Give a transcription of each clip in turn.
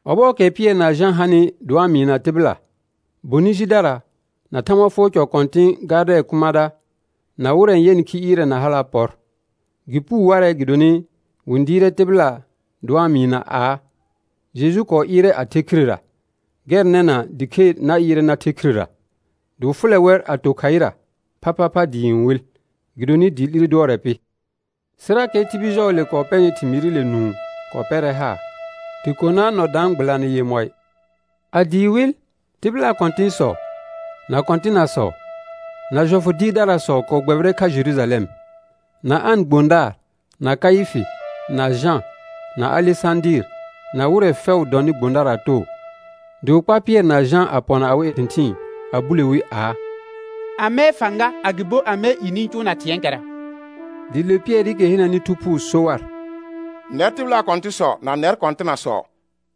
Ɔbɔɔkɛ Pɩɛr na Jã hanɩ dɩ wa-n mɩɩna tɩbɩla, bonɩ jidara na Thãgba fʋɔr cɔ kɔ̃tɩ̃ gardɛɛ̃ kʋmãda, na wɩrɛ n yɛnɩ khi ɩɩrɛ na hala' pɔr. Gɩ puu warɛ gɩdonɩ wɩ-n dɩɩrɛ tɩbɩla dɩ wa-n mɩɩna aa: Jeju kɔɔ ɩɩrɛ a the khirera, gɛr nɛna dɩ khe na ɩɩrɛ na the khirera. Dɩ wɩ fʋlɛ wɛr a to khaɩra phaphapha dɩɩ n wɩl, gɩdonɩ dɩɩ 'lire dʋɔrɛ pɩ. Sɩrakɛ tibil jɔɔle kɔɔ pɛnɩ thɩmɩɩrɩle nũu kɔɔ pɛrɛ haar, dɩ konaa nɔ daan gbɩlanɩ yemɔɩ. A dɩɩ wɩl, tɩbɩlaa kɔ̃tɩ̃sɔ, na kɔ̃tɩnasɔ, na jɔfʋ dɩɩrdarasɔ kɔɔ gbɛbɩrɛ kha Jerujalɛm, na An gbõdaar, na Kaɩfɩ, na Jã, na Alesãdɩɩr, na wɩrɛ fɛʋ dɔnɩ gbõdaraa too. Dɩ wɩ kpar Pɩɛr na Jã a pɔna awɩ thɩ̃thɩɩn a bule wi aa: Amɛɛ fãga, agɩbo amɛɛ i nɩ-n cʋʋna thɩ̃ɛɛkɛra? Dɩ le Pɩɛrɩkɛ henəni Thu Phuu so war: Nɛr tɩbɩlaa kɔ̃tɩ̃sɔ na nɛr kɔ̃tɩnasɔ,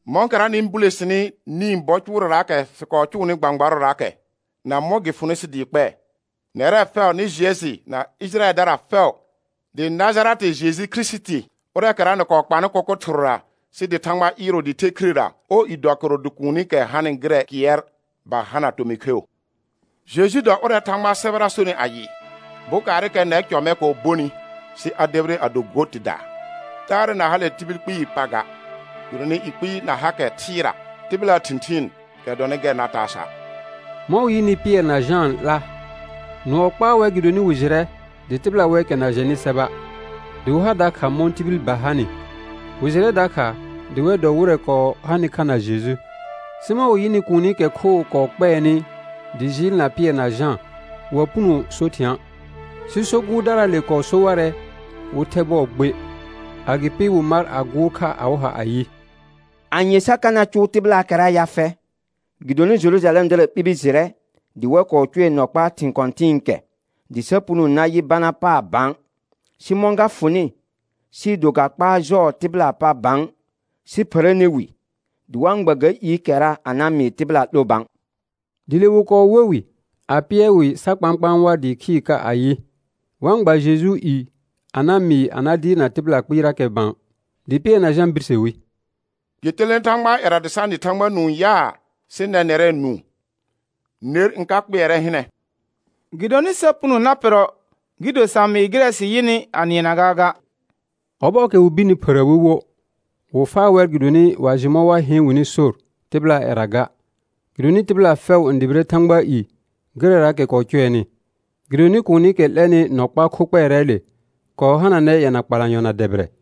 mɔ̃kɛra nɩ-n bule sini nĩ bɔ cʋʋrɛraakɛ sɩ kɔɔ cʋʋnɩ gbãgbarʋraakɛ na mɔ̃ gɩ fʋnɩ sɩ dɩ kpɛɛ, nɛrɛ fɛʋ nɩ jɩɛ jɩ na Ɩjɩrayɛldara fɛʋ, dɩ Najarɛtɩ Jeju Kirisiti, ʋrɛɛkɛra nɩ kɔɔ kpanɩ kʋkʋ thɩrʋra sɩ dɩ Thãgba ɩɩrʋʋ dɩ the khirera, ɔɔ i dɔ kɩrʋ dɩ kuunikɛ hanɩ gɩrɛ kɩɛr ba hana tomɩ kheu. Jeju dɔ ʋrɛ Thãgbaa sɛbɛra sonɩ ayɩ: «Bokaarɩkɛ nɛr cɔ mɛ kɔɔ bonɩ, sɩ a debire a do go tɩdaa.» Taarɛ na hale tibil kpɩɩ pa ga, gɩdonɩ i kpɩɩ na hakɛ thɩɩra tɩbɩlaa thɩ̃thɩɩn kɛ dɔnɩ gɛr na taa sa'. Mɔ̃ wɩ yɩnɩ Pɩɛr na Jãa 'la, nʋɔ kpaa wɛr gɩdonɩ wɩ jɩrɛ dɩ tɩbɩla wɛɛkɛ na jɛnɩ sɛba' dɩ wɩ har dakha mɔ̃ tibil ba hanɩ; wɩ jɩrɛ dakha dɩ wɛr dɔ wɩrɛ kɔɔ hanɩ kha na Jeju. Sɩ mɔ̃ wɩ yɩnɩ kuunikɛ khoo kɔɔ kpɛɛnɩ dɩ jɩɩlna Pɩɛr na Jã, wa puno so thɩ̃a'. Sɩ so gʋʋrdaraale kɔɔ so warɛ wɩ thɛ bɔɔ gbe, agɩpɩ wɩ mar a gʋʋr kha awɩ ha ayɩ: Anye sa ka na cʋʋ tɩbɩlaakɛra ya fɛ? Gɩdonɩ Jerujalɛmdara ɓibi jɩrɛ dɩ wɛr kɔɔ cʋɛ nɔ kpaa thɩ̃ kɔ̃tɩ̃ɩkɛ, dɩ sa puno na yɩ bana paar bã. Sɩ mɔ̃ ga fʋnɩ sɩɩ do ga kpaar jɔɔ tɩbɩlaa pa bã, sɩ phərəne wi dɩ wa-n gba ga iikɛra a na mɩɩ tɩbɩla 'lo bã. Dɩ le wɩ kɔɔ we wɩ a pɩɛr wɩ sa kpãkpãa war dɩɩ khɩɩr ka ayɩ, wa-n gba Jejuu i a na mɩɩ a na dɩɩrna tɩbɩla kpɩɩrakɛ bã. Dɩ Pɩɛr na Jã birse wi: Gɩ telene Thãgbaa ƴɛra dɩ sa nɩ Thãgba nũu yaa, sɩ nɛ nɛrɛ nũu, ner n ka kpɩɛrɛ hɩnɛ. Gɩdonɩ sa puno na pɩrrɔ gɩ do sa mɩɩ gɩrɛ sɩ yɩnɩ a nɩɛna gaaga. Ɔbɔɔkɛ wɩ birni phərə wi wo, wɩ faa wɛr gɩdonɩ wa jɩ mɔ̃ wa heen wɩnɩ sor tɩbɩlaa ƴɛra ga, gɩdonɩ tɩbɩla fɛʋ n dʋbɩrɛ Thãgbaa i gɩrɛraakɛ kɔɔ cʋɛnɩ. Gɩdonɩ kuunikɛ 'lɛnɩ nɔ kpaa kho kpɛɛrɛɛle kɔɔ hananɛ yɛna kpalanyɔ na dɛbɩrɛ.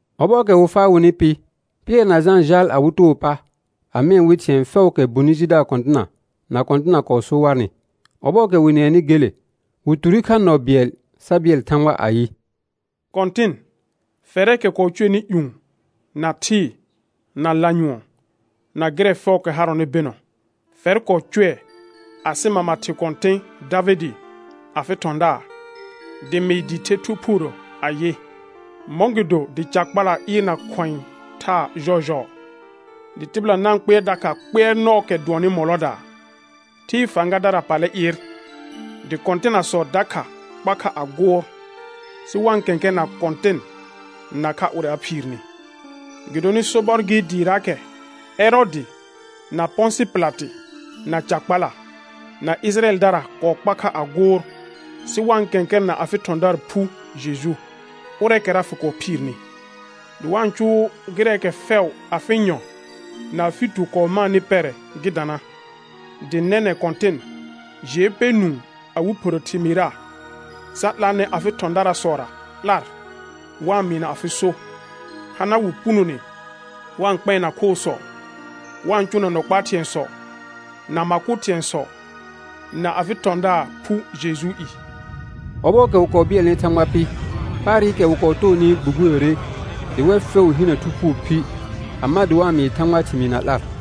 Ɔbɔɔkɛ wɩ faa wɩnɩ pɩ, Pɩɛr na Jã jaal awɩ too pa a mɩɛ wɩ thɩ̃ɛ fɛʋʋkɛ bonɩ jidaar kɔ̃tɩna na kɔ̃tɩna kɔɔ so warnɩ. Ɔbɔɔkɛ wɩ nɩɛnɩ gele, wɩ ture kha nɔ bɩɛl sa bɩɛl Thãgba ayɩ: Kɔ̃tɩn, fɛrɛɛkɛ kɔɔ cʋɛnɩ ƴũ, na thɩɩ, na lanyʋɔn, na gɩrɛ fɛʋʋkɛ harɔnɩ bɩnɔ, fɛr kɔɔ cʋɛ asɩ mama thɩ kɔ̃tɩ̃ Davɩdɩ afɩ thɔ̃daar, dɩ mɩɩ dɩɩ the Thu Phuurə ayɩ: «Mɔ̃gɩdo dɩ ca kpala ɩɩrna khʋ̃ɛ thaa jɔɔjɔɔ, dɩ tɩbɩla na-n kpɩɛr dakha kpɩɛrnɔɔkɛ dʋɔnnɩ mɔlɔdaa? Thɩɩ fãgadara pallɛ ɩɩr, dɩ kɔ̃tɩnasɔ dakha kpa kha a gʋʋr, sɩ wa-n kɛ̃kɛrɛna Kɔ̃tɩn nakha ʋrɛ a phiirni.» Gɩdonɩ sobɔr gɩ dɩɩraakɛ Ɛrɔɔdɩ, na Pɔ̃sɩ Pɩlatɩ, na ca kpala, na Ɩjɩrayɛldara kɔɔ kpa kha a gʋʋr, sɩ wa-n kɛ̃kɛrɛna afɩ thɔ̃daar phu Jeju, ʋrɛɛkɛra fɩ kɔɔ phiirni, dɩ wa-n cʋʋ gɩrɛɛkɛ fɛʋ afɩ nyɔ̃ na afɩ tu kɔɔ maanɩ pɛrɛ gɩ dana. Dɩ nɛnɛ̃ Kɔ̃tɩn, jɩɛ pɛ nũu awɩ phərə thɩmɩɩra sa 'laanɛ afɩ thɔ̃darasɔra 'lar wa-n mɩɩna afɩ so; hana wɩ punone wa-n kpɛɛna khoosɔ, wa-n cʋʋna nɔ kpaa thɩ̃ɛsɔ, na ma kʋ thɩ̃ɛsɔ na afɩ thɔ̃daar phu Jejuu i. Ɔbɔɔkɛ wɩ kɔɔ bɩɛlnɩ Thãgba pɩ, paarɩkɛ wɩ kɔɔ toonɩ gbugbuyore dɩ wɛr fɛʋ hinə Thu Phuu phi, a ma dɩ wa-n mɩɩ Thãgbaa thɩmɩɩ na 'lar.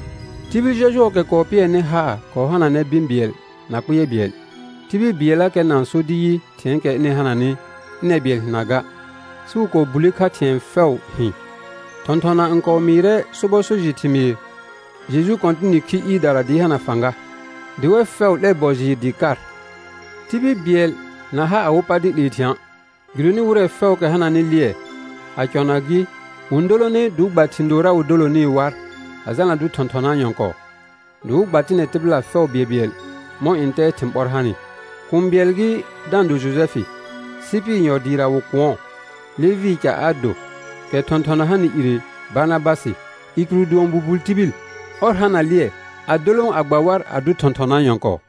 Tibil jɔjʋɔɔkɛ kɔɔ pɩɛrnɩ haar kɔɔ hananɛ bɩ̃ bɩɛl na kpɩɛr bɩɛl. Tibil bɩɛllakɛ na-n so dɩ yɩ thɩ̃ɛɛkɛ ɩnɩ hananɩ ɩnɛr bɩɛl hɩna ga, sɩ wɩ kɔɔ bulle kha thɩ̃ɛ fɛʋ hɩ̃. Thɔ̃thɔna n kɔɔ mɩɩrɛ sobɔ so jɩ thɩmɩɩr Jeju Kɔ̃tɩnɩ khi ɩɩrdara dɩɩ hana fãga, dɩ wɛr fɛʋ 'lɛr bɔ jɩɩr dɩɩ kar. Tibil bɩɛl na ha awɩ pa dɩ 'lee thɩ̃a', gɩdonɩ wɩrɛ fɛʋʋkɛ hananɩ lɩɛ, a cɔna gɩ, wɩ-n dolone dɩ wɩ gba thɩ̃ doora wɩ dolonɩɩ war a jalna dʋ thɔ̃thɔnaa nyɔ̃kɔɔ; dɩ wɩ gba tɩnɛ tɩbɩla fɛʋ bɩɛlbɩɛl mɔ̃ ntɛɛ thɩ̃ ɓɔr hanɩ. Kũu bɩɛl gɩ da-n do Jojɛfɩ; Sɩpɩr yɔ dɩɩra wɩ kʋ̃ɔ, Levɩɩ ca a do, kɛ thɔ̃thɔna hanɩ ire Barnabasɩ, i kɩrʋ dʋɔn buhul tibil; ɔr hana lɩɛ, a dolõ a gba war a dʋ thɔ̃thɔnaa nyɔ̃kɔɔ.